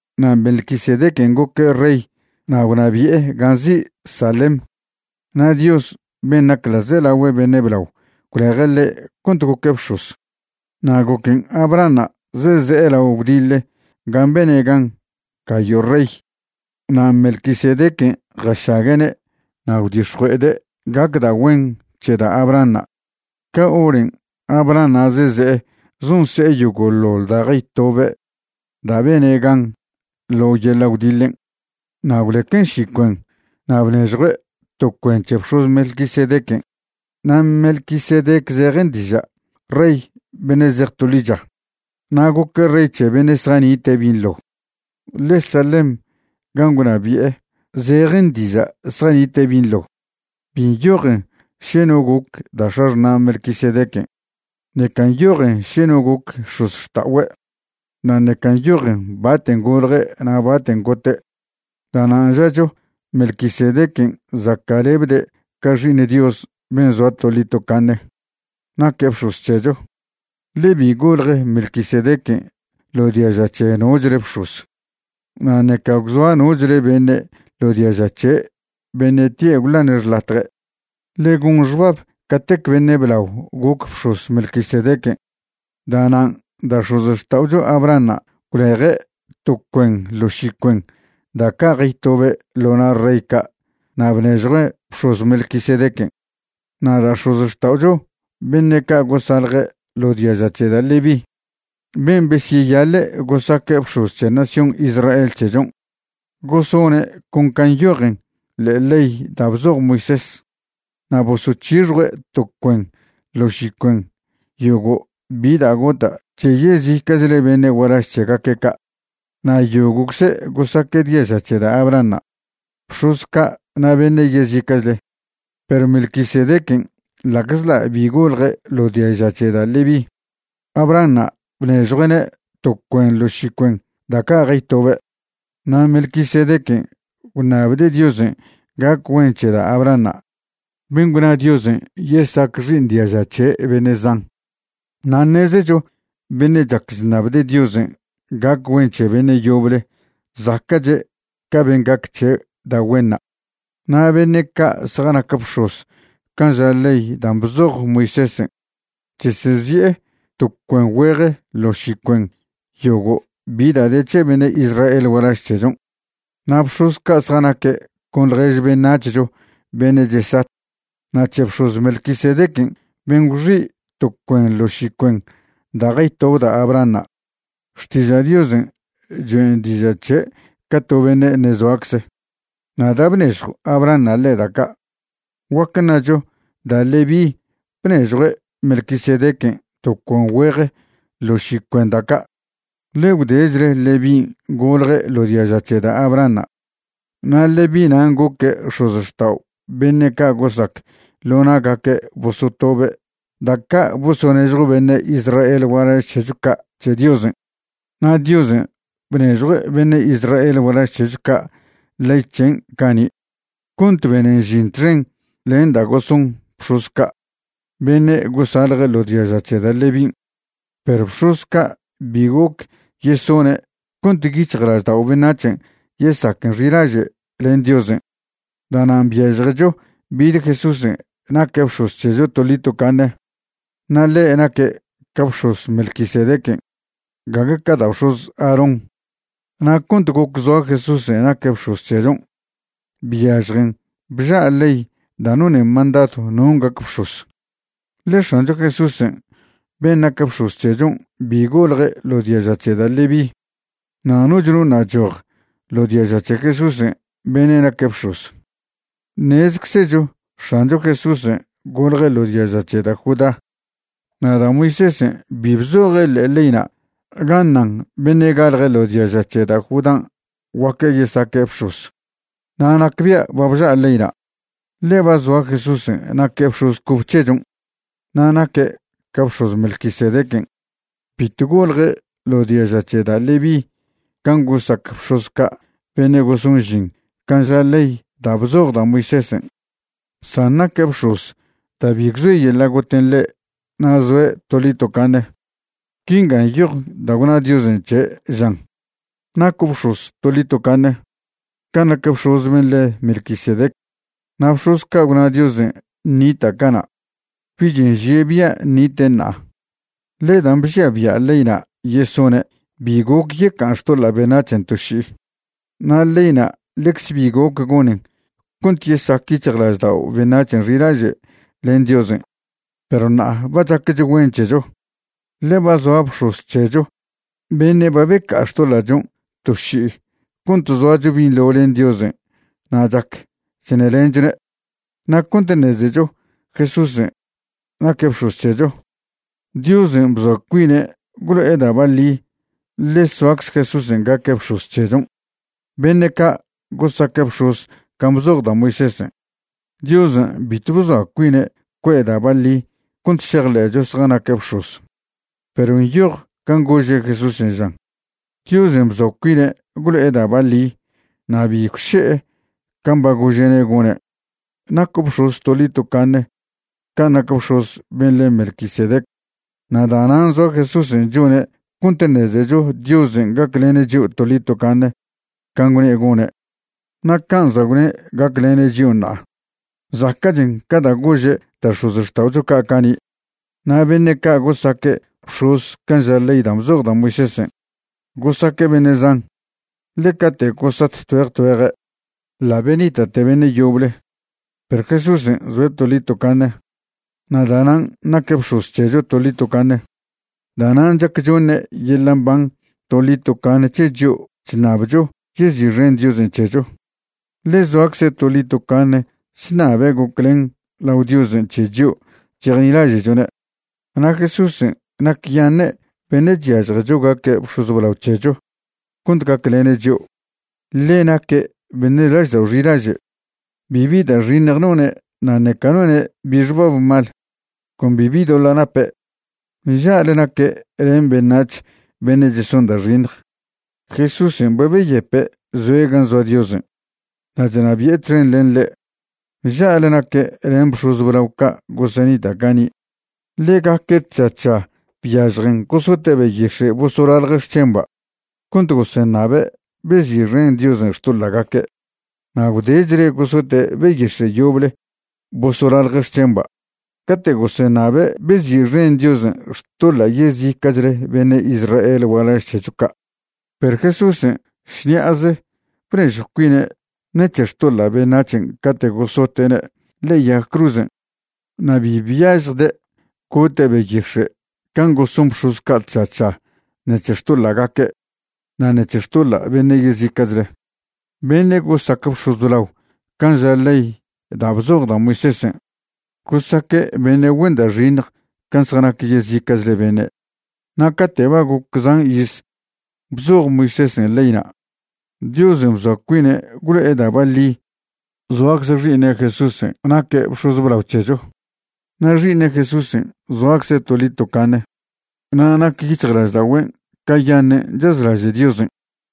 Na' Melquisedequen' goque' rey na' gwnabi'e gan' nzi' Salem, na' Dios ben' nac ḻa'zelagüe beṉe' blao gwleje' ḻe' cont goque' bx̱oz. Na' goquen' Abrahanṉa' zeze'e lao gwdiḻe gan' bene' gan gayo' rey, na' Melquisedequen' jašague'ne' na' gwdix̱jue'ede' gac da' güen c̱he da' Abrahanṉa'. Ca horen' Abrahanṉa' zeze'e zonse'e yogo'ḻoḻ da' jaytobe' da' bene' gan ḻo yeḻa' gwdiḻen', na' gwlequen' ši cuen na' bnežjue' to cuen c̱he bx̱oz Melquisedequen'. Na' Melquisedec zejen diža' “rey beṉe' zej to ḻicha”. Na' goque' rey c̱he beṉe' zjanite' binḻo, ḻe Salem gan' gwnabi'e zejen diža' “zjanite' binḻo”. Bi nyojen še no goc da' x̱axṉa' Melquisedequen'. Ṉeca nyojen še no goc x̱ozxta'ogüe', na' ṉeca nyojen baten' golje' na' baten' gote'. Da'nan' žacho Melquisedequen' zaca'lebde' ca Xi'iṉ Dios ben' zoa toḻi tocaṉe naque' bx̱oz c̱hecho, ḻe bi golje Melquisedequen' ḻo diaža c̱he nochle bx̱oz, na' ṉeca gwzoa nochle beṉe' ḻo diaža c̱he' beṉe' tie' gwḻane' xḻatje'. Ḻe gon xbab catec beṉe' blao goc bx̱oz Melquisedequen'. Da'nan' da' x̱ozxta'ocho Abrahanṉa' gwleje' to cuen ḻo ši cuen da' ca' jaytobe' ḻo na' rey ca' na' bnežjuen' bx̱oz Melquisedequen'. Na' da' x̱ozxta'ocho beṉe' ca' gosalje ḻo diaža c̱he da' Leví, ben' besyeyaḻe' gosaque' bx̱oz c̱he nación Israel c̱hechon', gosone' con can' nyojen ḻe'e ley da' bzoj Moisés, na' bosoc̱hixjue' to cuen ḻo ši cuen yogo' bi da' gota' c̱he yezica'chle beṉe' gualaž c̱hegaque' ca'. Na' yogo'cze' gosaque' diaža c̱he da' Abrahanṉa', bx̱oz ca' na' beṉe' yezica'chle. Perw Melquisedequen' ḻa'czḻa' bi golje' ḻo diaža c̱he da' Leví, Abrahanṉa' bnežjue'ne' to cuen ḻo ši cuen da' ca' jaytobe', na' Melquisedequen' gwṉabde' Diosen' gac güen c̱he da' Abrahanṉa' ben' gwna Diosen' yesac xi'iṉ diaža c̱he' beṉe' zan. Na' ṉezecho beṉe' chac chṉabde' Diosen' gac güen c̱he beṉe' yoble zaca'che' ca ben' gac c̱he' da' güenṉa'. Na' beṉe' ca' zjanac bx̱oz can' ža ley dan' bzoj Moisésen' chesezi'e to cuen güeje ḻo ši cuen yogo' bi da' de c̱he beṉe' Israel gualaž c̱hechon', na' bx̱oz ca' zjanaque' con ḻjež beṉac̱hcho beṉe' chesat. Na' c̱he bx̱oz Melquisedequen' ben' gwxi' to cuen ḻo ši cuen da' jaytob da' Abrahanṉa', Xtiža' Diosen' choen' diža' c̱he' ca to beṉe' ṉe' zoacze. Na' da' bnežjo Abrahanṉa' ḻe' da' ca', guac ṉacho da' Leví bnežjue' Melquisedequen' to cuen güeje ḻo ši cuen da' ca', ḻe gwdechle Levín' golje' ḻo diaža c̱he da' Abrahanṉa', na' Leví nan' goque' x̱ozxtao' beṉe' ca' gosac ḻo na'gaque' bosotobe' da' ca' bosonežjo beṉe' Israel gualaž c̱hecho ca' c̱he Diosen'. Na' Diosen' bnežjue' beṉe' Israel gualaž c̱hecho ca' ley c̱hen' cani' cont benen žin txen len da' goson bx̱oz ca' beṉe' gosalje' ḻo diaža c̱he da' Levín'. Perw bx̱oz ca' bi goc yesone' cont yic̱hjlaždao' beṉac̱hen' yesaquen xilaže' len Diosen'. Da'nan' byažjecho bid Jesúsen' naque' bx̱oz c̱hecho toḻi tocaṉe, na' ḻe' naque' ca bx̱oz Melquisedequen', gague ca da' bx̱oz Aarón. Na' cont goc zoa Jesúsen' naque' bx̱oz c̱hechon', byažjen bža' ley da' nonen mandadw non' gac bx̱oz. Ḻe X̱ancho Jesúsen' ben' nac bx̱oz c̱hechon' bi golje' ḻo diaža c̱he da' Leví, na' noch no ṉa' choj ḻo diaža c̱he Jesúsen' beṉe' naque' bx̱oz. Ṉezczecho X̱ancho Jesúsen' golje' ḻo diaža c̱he da' Judá, na' da' Moisésen' bi bzoje' ḻe'e leyna' ga ṉan beṉe' galje' ḻo diaža c̱he da' Judán' guac yesaque' bx̱oz. Na' nacbia' ba bža' leyna', ḻe ba zoa Jesúsen' naque' bx̱oz cobe c̱hechon' na' naque' ca bx̱oz Melquisedequen'. Bito golje' ḻo diaža c̱he da' Leví can' gosac bx̱oz ca' beṉe' goson žin can' ža ley da' bzoj da' Moisésen', san naque' bx̱oz da' bi gwzoe yeḻa' goten' ḻe' na' zoe' toḻi tocaṉe. Quinga nyoj da' gwna Diosen' c̱he', žan: Naco' bx̱oz toḻi tocaṉe, can' nac bx̱oz ben' le' Melquisedec. Na' bx̱oz ca' gwna Diosen' ṉita' cana', bich nžie' bia' ṉite' ṉa'a, ḻe dan' bžia bia' leyna' yesone' bi goc yeca'an xtoḻa' beṉac̱hen' to ši'i. Na' leyna' ḻecze bi goc gonen cont yesac yic̱hjlaždao' beṉac̱hen' xilaže' len Diosen'. Perw ṉa'a ba chaquech güen c̱hecho, ḻe ba zoa bx̱oz c̱hecho beṉe' ba beca'a xtoḻa'chon' to ši'i cont zoacho binḻo len Diosen' na' chac chṉelenchone'. Na' cont ṉezecho Jesúsen' naque' bx̱oz c̱hecho, Diosen' bzoa cuine' gwlo'e da' baḻi ḻe soacze Jesúsen' gaque' bx̱oz c̱hechon'. Beṉe' ca' gosaque' bx̱oz can' bzoj da' Moisésen', Diosen' bitw bzoa cuine' cue'e da' baḻi cont šejḻe'cho zjanaque' bx̱oz. Perw nyoj can' gože' Jesúsen', žan: Diosen' bzoa cuine' gwlo'e da' baḻi na' bi gwše'e can' ba gože'ne' gone': “Naco' bx̱oz toḻi tocaṉe can' nac bx̱oz ben' le' Melquisedec.” Na' da'nan' zoa Jesúsen' chone' cont ṉezecho Diosen' gaclene' chio' toḻi tocaṉe can' gwne' gone'. Na' can' za' gwne' gaclene' chio' ṉa'a, zaca'chen ca da' gože' da' x̱ozxta'ocho ca' cani'. Na' beṉe' ca' gosaque' bx̱oz can' ža ley dan' bzoj da' Miosésen', gosaque' beṉe' zan, ḻe cate' gosat tgüeje tgüeje', ḻa' benita'te beṉe' yoble. Perw Jesúsen' zoe' toḻi tocaṉe, na' da'nan' naque' bx̱oz c̱hecho toḻi tocaṉe. Da'nan' chac choṉe' yeḻa' mban toḻi tocaṉe c̱he chio' chṉabcho yezi'xen Diosen' c̱hecho, ḻe zoacze' toḻi tocaṉe chṉabe' goclen lao Diosen' c̱he chio' chejnilaže'chone'. Na' Jesúsen' nacyaṉe' beṉe' chyažjecho gaque' bx̱oz blao c̱hecho cont gaclene' chio', ḻe naque' beṉe' laždao' xilaže'. Bibi da' xiṉj none' na' ṉeca none' bi xbab mal, con bibi doḻa' nape'. Nža'le naque' len beṉac̱h beṉe' cheson da' xiṉj. Jesúsen' ba beyepe' zoe' gan' zoa Diosen', na' chnabi'e txen len ḻe'. Nža'le naque' len bx̱oz blao ca' gosenita' cani'. Ḻegaque' tža tža byažjen gosote' beyix̱e' bosolalje' xc̱hemba' cont goseṉabe' bezi'xen Diosen' xtoḻa'gaque', na' gwdechle gosote' beyix̱e' yoble bosolalje' xc̱hemba' cate' goseṉabe' bezi'xen Diosen' xtoḻa' yezica'chle beṉe' Israel gualaž c̱hecho ca'. Perw Jesúsen' šṉi'aze bnežjw cuine' ṉec̱he xtoḻa' beṉac̱hen' cate' gosote'ne' ḻe'e yag cruzen', na' bi byažjde' gote' beyix̱e' can' goson bx̱oz ca' tža tža ṉec̱he xtoḻa'gaque' na' ṉec̱he xtoḻa' beṉe' yezica'chle. Beṉe' gosac bx̱oz blao can' ža ley da' bzoj da' Moisésen' gosaque' beṉe' güen da' xiṉj can' zjanac yezica'chle beṉe'. Na' cate' ba goc zan iz bzoj Moisésen' leyna', Diosen' bzoa cuine' gwlo'e da' baḻi zoacze Xi'iṉe' Jesúsen' naque' bx̱oz blao c̱hecho. Na' Xi'iṉe' Jesúsen' zoacze' toḻi tocaṉe na' nac yic̱hjlaždagüen' cayaṉen' chazlaže' Diosen'.